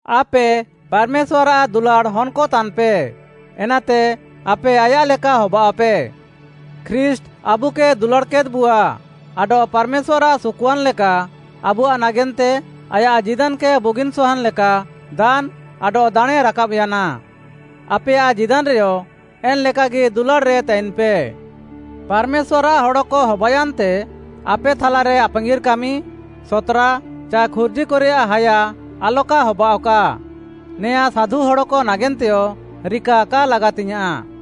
ଆପେ ପାର୍‌ମେଶ୍ୱାର୍‌ଆଃ ଦୁଲାଡ଼୍‌ ହନ୍‌କ ତାନ୍‌ପେ, ଏନାତେ ଆପେ ଆୟାଃ ଲେକା ହବାଅଃପେ। ଖ୍ରୀଷ୍ଟ୍‌ ଆବୁକେ ଦୁଲାଡ଼୍‌କେଦ୍‌ବୁଆ ଆଡଃ ପାର୍‌ମେଶ୍ୱାର୍‌ଆଃ ସୁକୁଆନ୍‌ ଲେକା ଆବୁଆଃ ନାଗେନ୍ତେ ଆୟାଃ ଜୀଦାନ୍‌କେ ବୁଗିନ୍‌ ସହାନ୍‌ ଲେକା ଦାନ୍‌ ଆଡଃ ଦାଣେଁ ରାକାବ୍‌ୟାନା, ଆପେୟାଃ ଜୀଦାନ୍‌ରେୟ ଏନ୍‌ଲେକାଗି ଦୁଲାଡ଼୍‌ରେ ତାଇନ୍‌ପେ। ପାର୍‌ମେଶ୍ୱାର୍‌ଆଃ ହଡ଼କ ହବାୟାନ୍ତେ, ଆପେ ଥାଲାରେ ଆପାଙ୍ଗିର୍‌ କାମି, ସତ୍‌ରା ଚାଏ ଖୁର୍ଜିକରେୟାଃ ହାୟା ଆଲକା ହବାଅଃକା। ନେଆଁ ସାଧୁ ହଡ଼କ ନାଗେନ୍ତେୟ ରିକା କା ଲାଗାତିଙ୍ଗ୍‌ୟାଁଃ।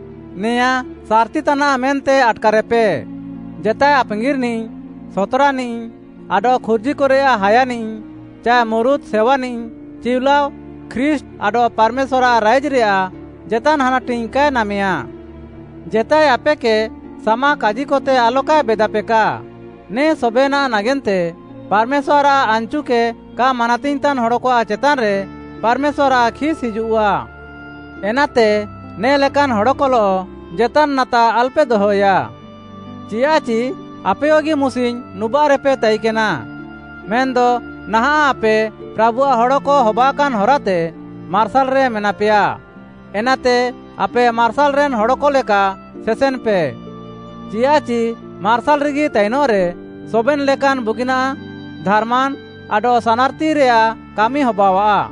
ନେଆଁଁ ସାର୍‌ତି ତାନାଃ ମେନ୍ତେ ଆଟ୍‌କାର୍‌କାପେ, ଜେତାଏ ଆପାଙ୍ଗିର୍‌ନିଃ, ସତ୍‌ରାନିଃ ଆଡଃ ଖୁର୍ଜିକରେୟାଃ ହାୟାନିଃ ଚାଏ ମୁରୁତ୍‌ ସେୱାନିଃ ଚିଉଲାଅ ଖ୍ରୀଷ୍ଟ୍‌ ଆଡଃ ପାର୍‌ମେଶ୍ୱାର୍‌ଆଃ ରାଇଜ୍‌ରେୟାଃ ଜେତାନ୍‌ ହାନାଟିଙ୍ଗ୍‌ କାଏ ନାମେୟାଁ। ଜେତାଏ ଆପେକେ ସାମାକାଜିକତେ ଆଲକାଏ ବେଦାପେକା, ନେ ସବେନାଃ ନାଗେନ୍ତେ ପାର୍‌ମେଶ୍ୱାର୍‌ଆଃ ଆନ୍‌ଚୁକେ କା ମାନାତିଙ୍ଗ୍‌ତାନ୍‌ ହଡ଼କଆଃ ଚେତାନ୍‌ରେ ପାର୍‌ମେଶ୍ୱାର୍‌ଆଃ ଖିସ୍‌ ହିଜୁଃଆ। ଏନାତେ ନେ ଲେକାନ୍‌ ହଡ଼କଲଃ ଜେତାନ୍‌ ନାତା ଆଲ୍‌ପେ ଦହଏୟା। ଚିୟାଃଚି ଆପେୟଗି ମୁସିଙ୍ଗ୍‌ ନୁବାଃରେପେ ତାଇନ୍‌କେନା। ମେନ୍‌ଦ ନାହାଁଃ ଆପେ ପ୍ରାଭୁଆଃ ହଡ଼କ ହବାକାନ୍‌ ହରାତେ ମାର୍ସାଲ୍‌ରେ ମେନାପେୟା। ଏନାତେ ଆପେ ମାର୍ସାଲ୍‌ରେନ୍‌ ହଡ଼କ ଲେକା ସେସେନ୍‌ପେ। ଚିୟାଃଚି ମାର୍ସାଲ୍‌ରେଗି ତାଇନଃରେ ସବେନ୍‌ ଲେକାନ୍‌ ବୁଗିନାଃ ଧାର୍‌ମାନ୍‌ ଆଡଃ ସାନାର୍‌ତିରେୟାଃ କାମି ହବାଅଃଆ।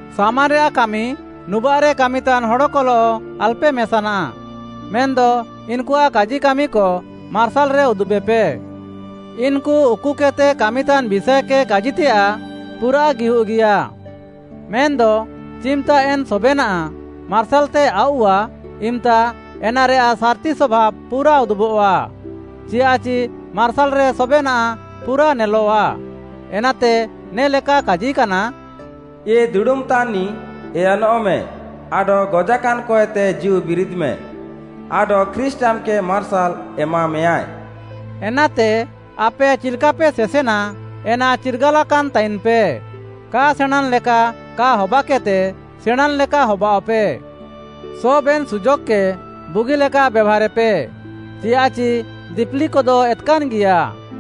ସାମାରେୟାଃ କାମି ନୁବାଃରେ କାମିତାନ୍‌ ହଡ଼କଲଃ ଆଲ୍‌ପେ ମେସାନା, ମେନ୍‌ଦ ଇନ୍‌କୁଆଃ କାଜିକାମିକ ମାର୍ସାଲ୍‌ରେ ଉଦୁବେପେ। ଇନ୍‌କୁ ଉକୁକେଦ୍‌ତେ କାମିତାନ୍‌ ବିଷାଏକେ କାଜିତେୟାଃ ପୁରାଃ ଗିହୁଃଗିୟା। ମେନ୍‌ଦ ଚିମ୍‌ତା ଏନ୍‌ ସବେନାଃ ମାର୍ସାଲ୍‌ତେ ଆଉଃଆ, ଇମ୍‌ତା ଏନାରେୟାଃ ସାର୍‌ତି ସଭାବ୍‌ ପୁରା ଉଦୁବଃଆ, ଚିୟାଃଚି ମାର୍ସାଲ୍‌ରେ ସବେନାଃ ପୁରା ନେଲଃଆ। ଏନାତେ ନେ'ଲେକା କାଜିକାନା, “ଏ ଦୁଡ଼ୁମ୍‌ତାନ୍‌ନିଃ, ଏୟନଃମେ ଆଡଃ ଗଜାକାନ୍‌କଏତେ ଜୀଉବିରିଦ୍‌ମେ! ଆଡଃ ଖ୍ରୀଷ୍ଟ୍‌ ଆମ୍‌କେ ମାର୍ସାଲ୍‌ ଏମାମେୟାଁଏ।” ଏନାତେ ଆପେ ଚିଲ୍‌କାପେ ସେସେନା ଏନା ଚିର୍ଗାଲାକାନ୍‌ ତାଇନ୍‌ପେ। କା ସେଣାଁଁନ୍‌ ଲେକା କା ହବାକେଦ୍‌ତେ ସେଣାଁଁନ୍‌ ଲେକା ହବାଅଃପେ। ସବେନ୍‌ ସୁଯୋଗ୍‌କେ ବୁଗିଲେକା ବେଭାରେପେ, ଚିୟାଃଚି ଦିପିଲିକଦ ଏତ୍‌କାନ୍‌ଗିୟା।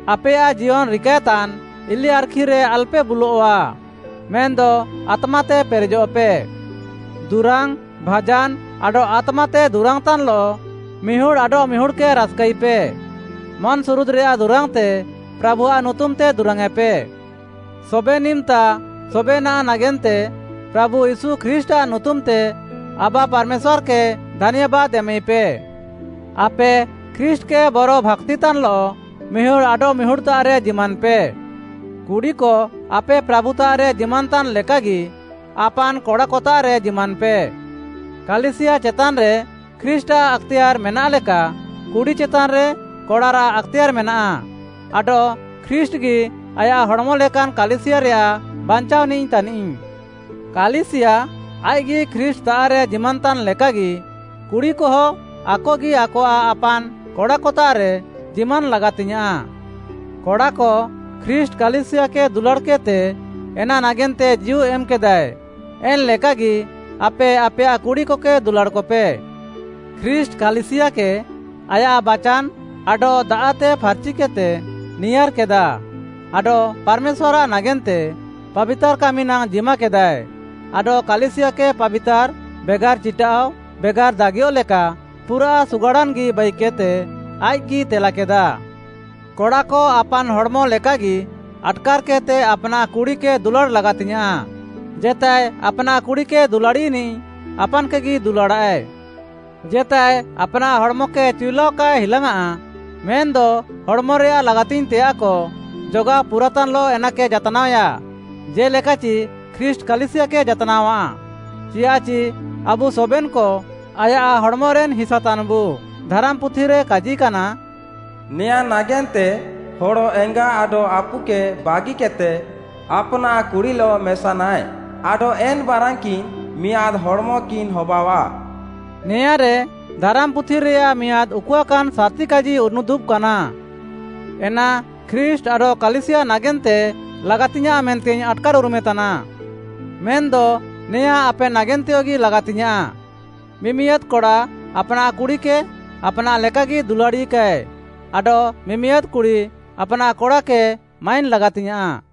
ଆପେୟାଃ ଜିୟନ୍‌ ରିକାଏତାନ୍‌ ଇଲିଆର୍‌ଖିରେ ଆଲ୍‌ପେ ବୁଲଃଆ, ମେନ୍‌ଦ ଆତ୍ମାତେ ପେରେଜଃପେ। ଦୁରାଙ୍ଗ୍‌, ଭାଜାନ୍‌ ଆଡଃ ଆତ୍ମାତେ ଦୁରାଙ୍ଗ୍‌ତାନ୍‌ଲଃ ମିହୁଡ଼ ଆଡଃମିହୁଡ଼୍‌କେ ରାସ୍‌କାଇପେ। ମନ୍‌ସୁରୁଦ୍‌ରେୟାଃ ଦୁରାଙ୍ଗ୍‌ତେ ପ୍ରାଭୁଆଃ ନୁତୁମ୍‌ତେ ଦୁରାଙ୍ଗ୍‌ୟେଁପେ। ସବେନ୍‌ ଇମ୍‌ତା ସବେନାଃ ନାଗେନ୍ତେ ପ୍ରାଭୁ ୟୀଶୁ ଖ୍ରୀଷ୍ଟ୍‌ଆଃ ନୁତୁମ୍‌ତେ ଆବା ପାର୍‌ମେଶ୍ୱାର୍‌କେ ଧାନ୍ୟାବାଦ୍‌ ଏମାଇପେ। ଆପେ ଖ୍ରୀଷ୍ଟ୍‌କେ ବରଭାକ୍ତିତାନ୍‌ଲଃ ମିହୁଡ଼୍‌ ଆଡଃମିହୁଡ଼୍‌ତାଃରେ ଜିମାନ୍‌ପେ। କୁଡ଼ିକ, ଆପେ ପ୍ରାଭୁତାଃରେ ଜିମାନ୍‌ତାନ୍‌ ଲେକାଗି ଆପାନ୍‌ କଡ଼ାକତାଃରେ ଜିମାନ୍‌ପେ। କାଲିସିୟା ଚେତାନ୍‌ରେ ଖ୍ରୀଷ୍ଟ୍‌ଆଃ ଆକ୍‌ତେୟାର୍‌ ମେନାଃ ଲେକା କୁଡ଼ି ଚେତାନ୍‌ରେ କଡ଼ାରାଃ ଆକ୍‌ତେୟାର୍‌ ମେନାଃ, ଆଡଃ ଖ୍ରୀଷ୍ଟ୍‌ଗି ଆୟାଃ ହଡ଼୍‌ମ ଲେକାନ୍‌ କାଲିସିୟାରେୟାଃ ବାଞ୍ଚାଅନିଃ ତାନିଃ। କାଲିସିୟା ଆଇଃକ୍‌ଗି ଖ୍ରୀଷ୍ଟ୍‌ତାଃରେ ଜିମାନ୍‌ତାନ୍‌ ଲେକାଗି, କୁଡ଼ିକହ ଆକଗି ଆକଆଃ ଆପାନ୍‌ କଡ଼ାକତାଃରେ ଜିମାନ୍‌ ଲାଗାତିଙ୍ଗ୍‌ୟାଁଃ। କଡ଼ାକ, ଖ୍ରୀଷ୍ଟ୍‌ କାଲିସିୟାକେ ଦୁଲାଡ଼୍‌କେଦ୍‌ତେ, ଏନା ନାଗେନ୍ତେ ଜୀଉ ଏମ୍‌କେଦାଏ ଏନ୍‌ ଲେକାଗି ଆପେ ଆପେୟାଃ କୁଡ଼ିକକେ ଦୁଲାଡ଼୍‌କପେ। ଖ୍ରୀଷ୍ଟ୍‌ କାଲିସିୟାକେ ଆୟାଃ ବାଚାନ୍‌ ଆଡଃ ଦାଆଃତେ ଫାର୍‌ଚିକେଦ୍‌ତେ ନିୟାର୍‌କେଦା ଆଡଃ ପାର୍‌ମେଶ୍ୱାର୍‌ଆଃ ନାଗେନ୍ତେ ପାବିତାର୍‌ କାମି ନାଙ୍ଗ୍‌ ଜିମାକେଦାଏ, ଆଡଃ କାଲିସିୟାକେ ପାବିତାର୍‌, ବେଗାର୍‌ ଚିଟାଃଅ, ବେଗାର୍‌ ଦାଗିୟଃ ଲେକା ପୁରାଃ ସୁଗାଡ଼ାନ୍‌ଗି ବାଇକେଦ୍‌ତେ ଆଇଃକ୍‌ଗି ତେଲାକେଦା। କଡ଼ାକ ଆପାନ୍‌ ହଡ଼୍‌ମ ଲେକାଗି ଆଟ୍‌କାର୍‌କେଦ୍‌ତେ ଆପ୍‌ନାଃ କୁଡ଼ିକେ ଦୁଲାଡ଼୍‌ ଲାଗାତିଙ୍ଗ୍‌ୟାଁଃ। ଜେତାଏ ଆପ୍‌ନାଃ କୁଡ଼ିକେ ଦୁଲାଡ଼ିନିଃ, ଆପାନ୍‌କେଗି ଦୁଲାଡ଼ାଃଏ। ଜେତାଏ ଆପ୍‌ନାଃ ହଡ଼୍‌ମକେ ଚିଉଲାଅ କାଏ ହିଲାଙ୍ଗ୍‌ଆଁ। ମେନ୍‌ଦ ହଡ଼୍‌ମରେୟାଃ ଲାଗାତିଙ୍ଗ୍‌ତେୟାଃକ ଜଗାଅ ପୁରାତାନ୍‌ଲଃ ଏନାକେ ଜାତ୍‌ନାଅଏୟା, ଜେ'ଲେକାଚି ଖ୍ରୀଷ୍ଟ୍‌ କାଲିସିୟାକେ ଜାତ୍‌ନାଅଆ, ଚିୟାଃଚି ଆବୁ ସବେନ୍‌କ ଆୟାଃ ହଡ଼୍‌ମରେନ୍‌ ହିସା ତାନ୍‌ବୁ। ଧାରାମ୍‌ପୁଥିରେ କାଜିକାନା, “ନେଆଁଁ ନାଗେନ୍ତେ ହଡ଼ ଏଙ୍ଗା ଆଡଃ ଆପୁକେ ବାଗିକେଦ୍‌ତେ ଆପ୍‌ନାଃ କୁଡ଼ିଲଃ ମେସାନାଃଏ ଆଡଃ ଏନ୍‌ ବାରାନ୍‌କିନ୍‌ ମିଆଁଦ୍‌ ହଡ଼୍‌ମକିନ୍‌ ହବାଅଃଆ।” ନେଆଁଁରେ ଧାରାମ୍‌ପୁଥିରେୟାଃ ମିଆଁଦ୍‌ ଉକୁଆକାନ୍‌ ସାର୍‌ତି କାଜି ଉନୁଦୁବ୍‌କାନା: ଏନା ଖ୍ରୀଷ୍ଟ୍‌ ଆଡଃ କାଲିସିୟା ନାଗେନ୍ତେ ଲାଗାତିଙ୍ଗ୍‌ୟାଁଃ ମେନ୍ତେଇଙ୍ଗ୍‌ ଆଟ୍‌କାର୍‌ଉରୁମେ ତାନା। ମେନ୍‌ଦ ନେଆଁଁ ଆପେ ନାଗେନ୍ତେୟଗି ଲାଗାତିୟାଁ। ମିମିଆଦ୍‌ କଡ଼ା ଆପ୍‌ନାଃ କୁଡ଼ିକେ ଆପ୍‌ନାଃ ଲେକାଗି ଦୁଲାଡ଼ିକାଏ ଆଡଃ ମିମିଆଦ୍‌ କୁଡ଼ି ଆପ୍‌ନାଃ କଡ଼ାକେ ମାଇନ୍‌ ଲାଗାତିଙ୍ଗ୍‌ୟାଁଃ।